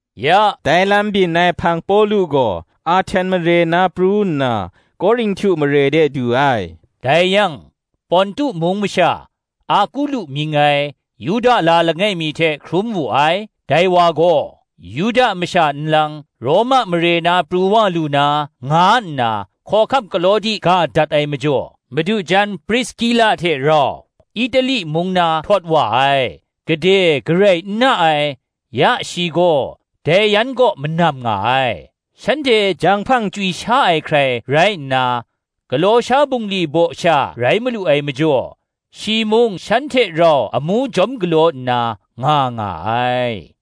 Ya dai lam byin ai hpang Pawlu gaw, Ahten mare na pru nna, Korinhtu mare de du ai. Dai yang, Pontu mung masha, Akula mying ai, Yuda la langai mi hte hkrum wu ai; dai wa gaw, ‘Yuda masha nlang, Roma mare na pru wa lu na,’ nga nna, Hkawhkam Klawdi ga dat ai majaw, madu jan Priskila hte rau Itali mung na htawt wa ai, gade garai n na ai; ya shi gaw, dai yan kaw manam nga ai: shanhte janghpang chywi sha ai hkrai rai nna, galaw sha bungli baw sha rai malu ai majaw, shi mung shan hte rau amu jawm galaw nna, nga nga ai.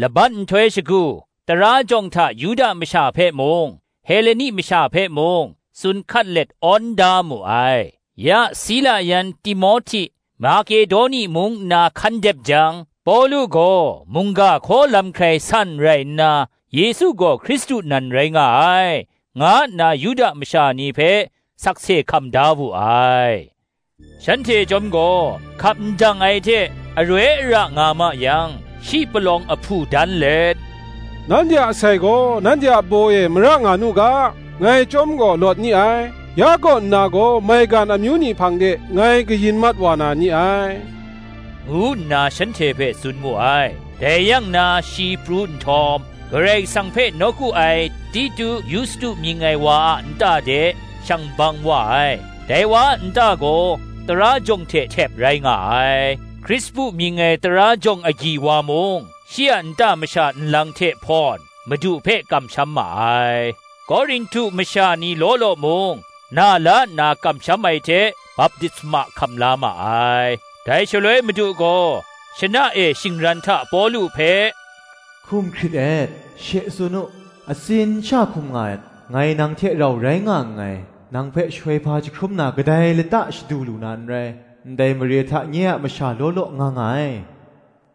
Laban nhtoi shagu, tara jawng hta Yuda masha hpe mung, Heleni masha hpe mung, tsun hkat let awn da mu ai. Ya Sila yan Timohti Makedoni mung nna hkan dep jang, Pawlu gaw mungga hkaw lam hkrai san rai nna, Yesu gaw Hkristu nan rai nga ai, nga nna Yuda masha ni hpe sakse hkam da wu ai. Shanhte chyawm gaw hkap ndang ai hte aroi ara nga ma yang, shi palawng ahpu dan let, “Nanhte a asai gaw nanhte a baw e mara nga nu ga; ngai chyawm gaw lawt ni ai: ya kaw nna gaw, maigan amyu ni hpang de ngai kayin mat wa na ni ai,” ngu nna shanhte hpe tsun mu ai. Dai yang na shi pru nhtawm, Karai Kasang hpe nawku ai Titu Yustu mying ai wa a nta de, shang bang wa ai; dai wa a nta gaw tara jawng hte htep rai nga ai. Krispu mying ai tara jawng agyi wa mung, shi a nta masha nlang hte hte hpawn, Madu hpe kamsham ma ai: Korinhtu masha ni law law mung, na la nna kamsham ai hte baptisma hkam la ma ai. Dai shaloi Madu gaw shana e shingran hta Pawlu hpe “hkum hkrit et; she tsun u, atsin sha hkum nga et; ngai nang hte rau rai nga nngai, nang hpe shoihpa jahkrum na kadai lata shadu lu na n rai; ndai mare hta nye a masha law law nga nga ai,”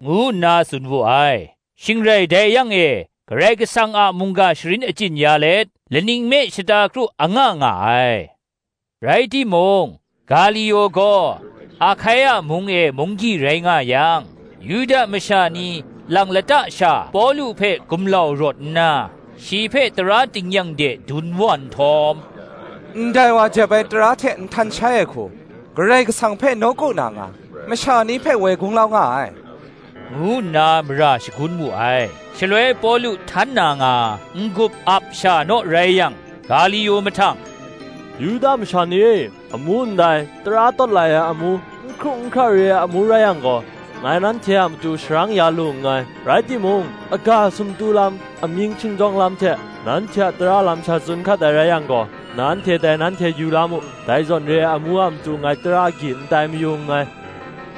ngu nna tsun wu ai. Shing rai dai yang e Karai Kasang a mungga sharin achyin ya let, laning me shata kru anga nga ai. Rai timung, Galio gaw Ahkaia mung e munggyi rai nga yang, Yuda masha ni lang lata sha Pawlu hpe gumlau rawt nna, shi hpe tara tingnyang de dun wa nhtawm, “Ndai wa jep ai tara hte nhtan shai ai hku, Karai Kasang hpe nawku na nga, masha ni hpe woi gunglau nga ai,” ngu nna mara shagun mu ai. Shaloi Pawlu htan na nga, n-gup ap sha naw rai yang, Galio mahtang, “Yuda masha ni e, amu ndai, tara tawt lai ai amu, n hkru n hkra re ai amu rai yang gaw, ngai nanhte a matu sharang ya lu na nngai: rai timung, aga sumtu lam, amying shingjawng lam hte, nanhte a tara lam sha tsun hkat ai rai yang gaw, nanhte dai nanhte yu la mu: dai zawn re ai amu a matu ngai tara agyi n tai mayu nngai,”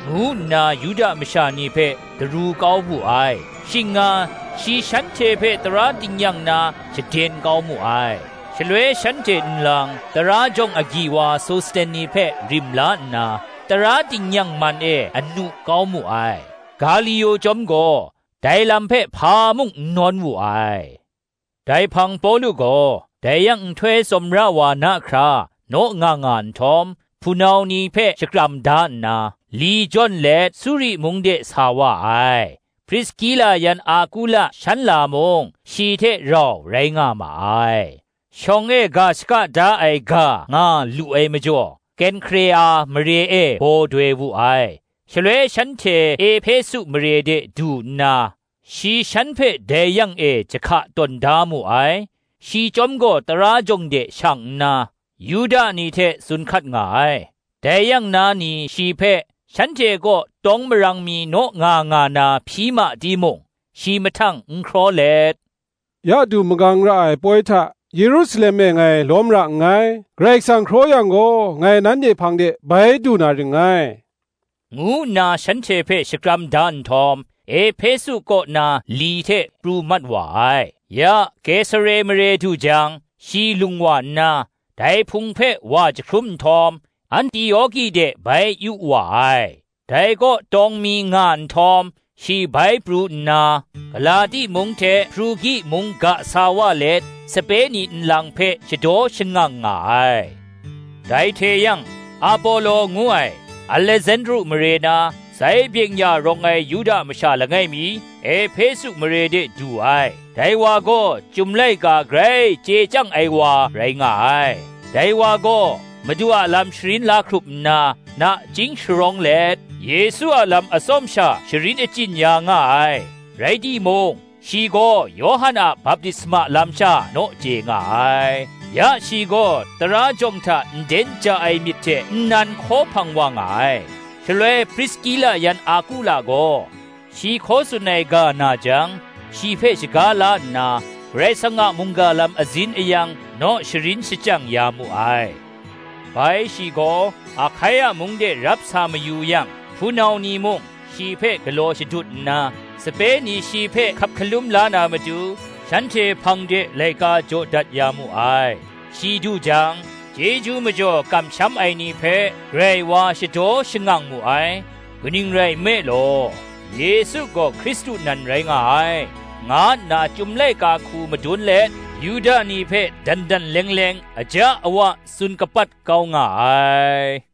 ngu nna Yuda masha ni hpe daru kau wu ai. Shing nga shi shanhte hpe tara tingnyang na shaden kau mu ai. Shaloi shanhte nlang tara jawng agyi wa Sosteni hpe rim la nna, tara tingnyang man e anu kau mu ai: Galio chyawm gaw, dai lam hpe hpa mung n nawn wu ai. Dai hpang Pawlu gaw, dai yang nhtoi tsawmra wa na hkra naw nga nga nhtawm, hpunau ni hpe shakram da nna, li jawn let Suri mung de sa wa ai; Priskila yan Akula shan la mung, shi hte rau rai nga ma ai; shawng e ga shaka da ai ga nga lu ai majaw, Kenhkrea mare e baw doi wu ai. Shaloi shanhte Ehpesu mare de du nna, shi shan hpe dai yang e jahka tawn da mu ai: shi chyawm gaw tara jawng de shang nna, Yuda ni hte tsun hkat nga ai. Dai yang na ni shi hpe, shanhte kaw tawng marang mi naw nga nga na hpyi ma timung, shi mahtang n hkraw let, “Ya du magang ra ai poi hta Yerusalem e ngai lawm ra nngai. Karai Kasang hkraw yang gaw, ngai nanhte hpang de bai du na ring ngai,” ngu nna shanhte hpe shakram da nhtawm, Ehpesu kaw na li hte pru mat wa ai. Ya Kesare mare du jang, shi lung wa nna, dai Hpung hpe wa jahkrum nhtawm, Antioki de bai yu wa ai. Dai kaw tawng mi nga nhtawm, shi bai pru nna, Galati mung hte Hprugi mung ga sa wa let, sape ni nlang hpe shadaw shangang nga ai. Dai hte yang, Apolo ngu ai, Alesandru mare na, zai byeng-ya rawng ai Yuda masha langai mi, Ehpesu mare de du ai: dai wa gaw, Chyum laika grai chye chyang ai wa rai nga ai. Dai wa gaw, Madu a lam sharin la hkrup nna, nachying sharawng let, Yesu a lam atsawm sha sharin achyin ya nga ai; rai timung, shi gaw Yawhan a baptisma lam sha naw chye nga ai: ya shi gaw tara jawng hta nden ja ai myit hte nnan hkaw hpang wa nga ai. Shaloi Priskila yan Akula gaw, shi hkaw tsun ai ga na jang, shi hpe shaga la nna, Karai Kasang a mungga lam azin ayang naw sharin shachyang ya mu ai. Bai shi gaw, Ahkaia mung de rap sa mayu yang, hpunau ni mung, shi hpe galaw shadut nna, sape ni shi hpe hkap hkalum la na matu, shanhte hpang de laika jaw dat ya mu ai: shi du jang, chyeju majaw kamsham ai ni hpe, grai wa shadaw shangang mu ai: kaning rai nme law, Yesu gaw Hkristu nan rai nga ai, nga nna Chyum laika hku madun let, Yuda ni hpe dan dan leng leng, aja awa tsun kapat kau nga ai.